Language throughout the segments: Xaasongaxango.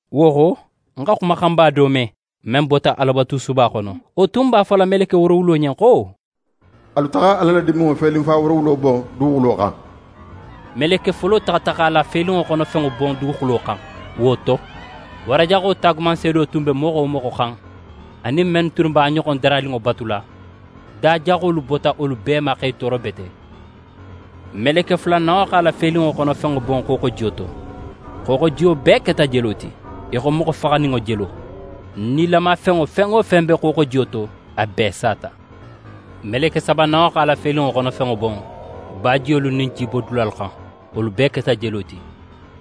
Wo xo, ń xa xumaxanba do me, men bota Alabatusuba xono. Wo tun b'a fola meleke woorowulo ɲen xo: «Alu taxa Ala la diminŋo felinfa woorowulo bon duguxulo xan!» Meleke folo taxata x'a la felinŋo xono fenŋo bon duguxulo xan. Wo to, wara jaxo taagumanseedo tun be moxo wo moxo xan anin men tunnu b'a ɲoxonŋo daraninŋo batula, da jaxolu bota wolu bee ma x'e tooro bete. Meleke fulananŋo x'a la felinŋo xono fenŋo bon xooxojiyo to. Xooxojiyo bee keta jelo ti, í xo moxo faxaninŋo jelo. Nilamafenŋo fen wo fen be xooxojiyo to, a bee sata. Meleke sabananŋo x'a la felinŋo xono fenŋo bon bajiyolu nin jibodulalu xan, wolu bee keta jelo ti.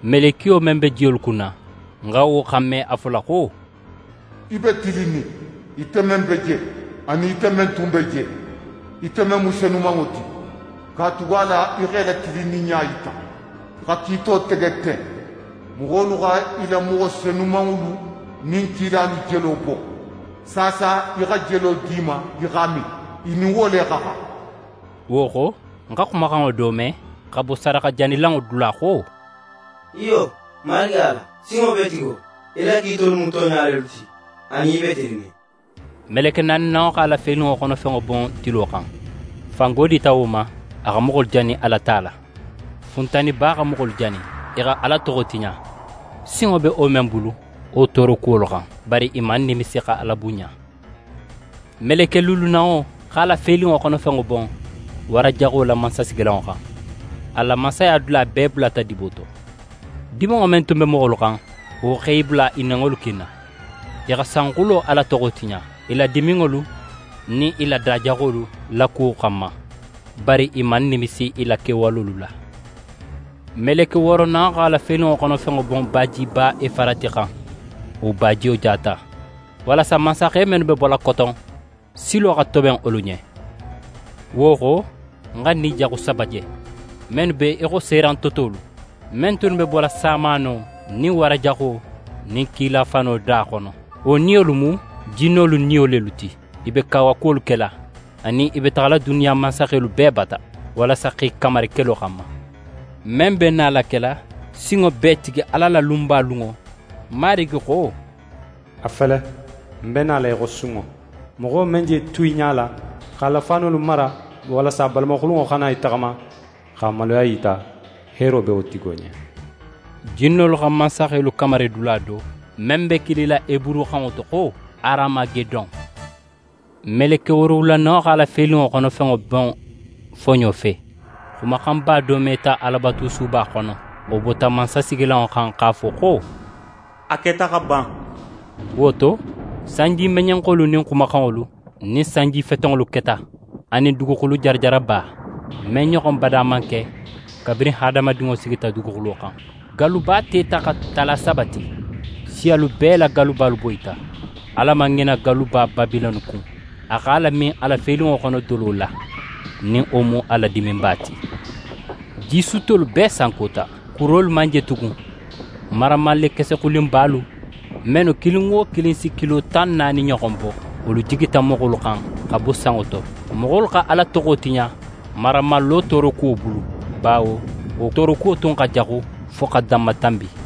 Melekiyo men be jiyolu kunna, ń xa wo xanme a fola xo: «Í be tilinnin, ite men be je, anin ite men tun be je, ite men mu Senumanŋo ti, katugala í xa í la tilinninɲa yita xa kiito tege ten. Moxolu xa í la moxo senumanŋolu nin kilalu jelo bon, saasa í xa jelo di i ma i x'a min. I nin wo le xa xan!» Wo xo, ń xa xumaxanŋo do me, xa bo sadaxajanilanŋo dula xo: «Iyo, Marigi Ala, Sinŋobeetigo, í la kiitolu mu tonɲa lelu ti, anin i be tilinnin!» Meleke naaninanŋo x'a la felinŋo xono fenŋo bon tilo xan. Fango dita wo ma a xa moxolu jani a la ta la. Funtaniba xa moxolu jani. I xa Ala toxo tiɲa, sinŋo be wo men bulu wo toorokuwolu xan. Bari i man nimisi xa Ala bunɲa. Meleke luulunanŋo x'a la felinŋo xono fenŋo bon wara jaxo la mansasigilanŋo xan. A la mansaya dula bee bulata dibo to. Diminŋo men tun be moxolu xan, wo x'e bula i nenŋolu kinna. I xa sanxulo Ala toxo tiɲa, i la diminŋolu nin i la da jaxolu la kuwo xanma. Bari i man nimisi i la kewalolu la. Meleke wooronanŋo x'a la felinŋo xono fenŋo bon bajiba Efarati xan. Wo bajiyo jata, walasa mansaxe mennu be bola koton, silo xa toben wolu ɲen. Wo xo, ń xa ni jaxu saba je, mennu be í xo serantotolu, men tunnu be bola samaano nin wara jaxo nin kila fano da xono. Wo niyolu mu jinnolu niyo lelu ti. I be kawakuwolu kela anin i be taxala duniya mansaxelu bee bata, walasa x'e kamari kelo xanma, men be nala kela Sinŋobeetigi Ala la lunba lunŋo. Marigi xo: «A fele, ń be nala í xo sunŋo! Moxo men je tu í ɲala, x'a la faanolu mara, walasa a balamaxulunŋo xana í taxama, x'a maluya yita, heero be wo tigo ɲen.» Jinnolu xa mansaxelu kamari dula do, men be kilila heburuxanŋo to xo «Haramagedon.» Meleke woorowulananŋo x'a la felinŋo xono fenŋo bon foɲo fe. Xumaxanba do meta Alabatusuba xono, wo bota mansasigilanŋo xan x'a fo xo: «A keta xa ban.» Wo to, sanjimeɲenxolu nin xumaxanŋolu nin sanjifetenŋolu keta, anin duguxulu jarajaraba, men ɲoxon bada man ke kabirin hadamadinŋo sigita duguxulo xan. Galluba teta xa tala saba ti. Siyalu bee la gallubalu boyita. Ala man ŋina galluba Babilone kun. A x'a lamin a la felinŋo xono dolo la, nin wo mu a la diminba ti. Jisuttolu bee sankota, kurolu man je tugun. Maramallekese xulinbalu, mennu kilin wo kilin si kilo tan naani ɲoxon bo, wolu jigita moxolu xan xa bo sanŋo to. Moxolu xa Ala toxo tiɲa maramallo toorokuwo bulu, bawo wo toorokuwo tun xa jaxu fo xa danmatanbi.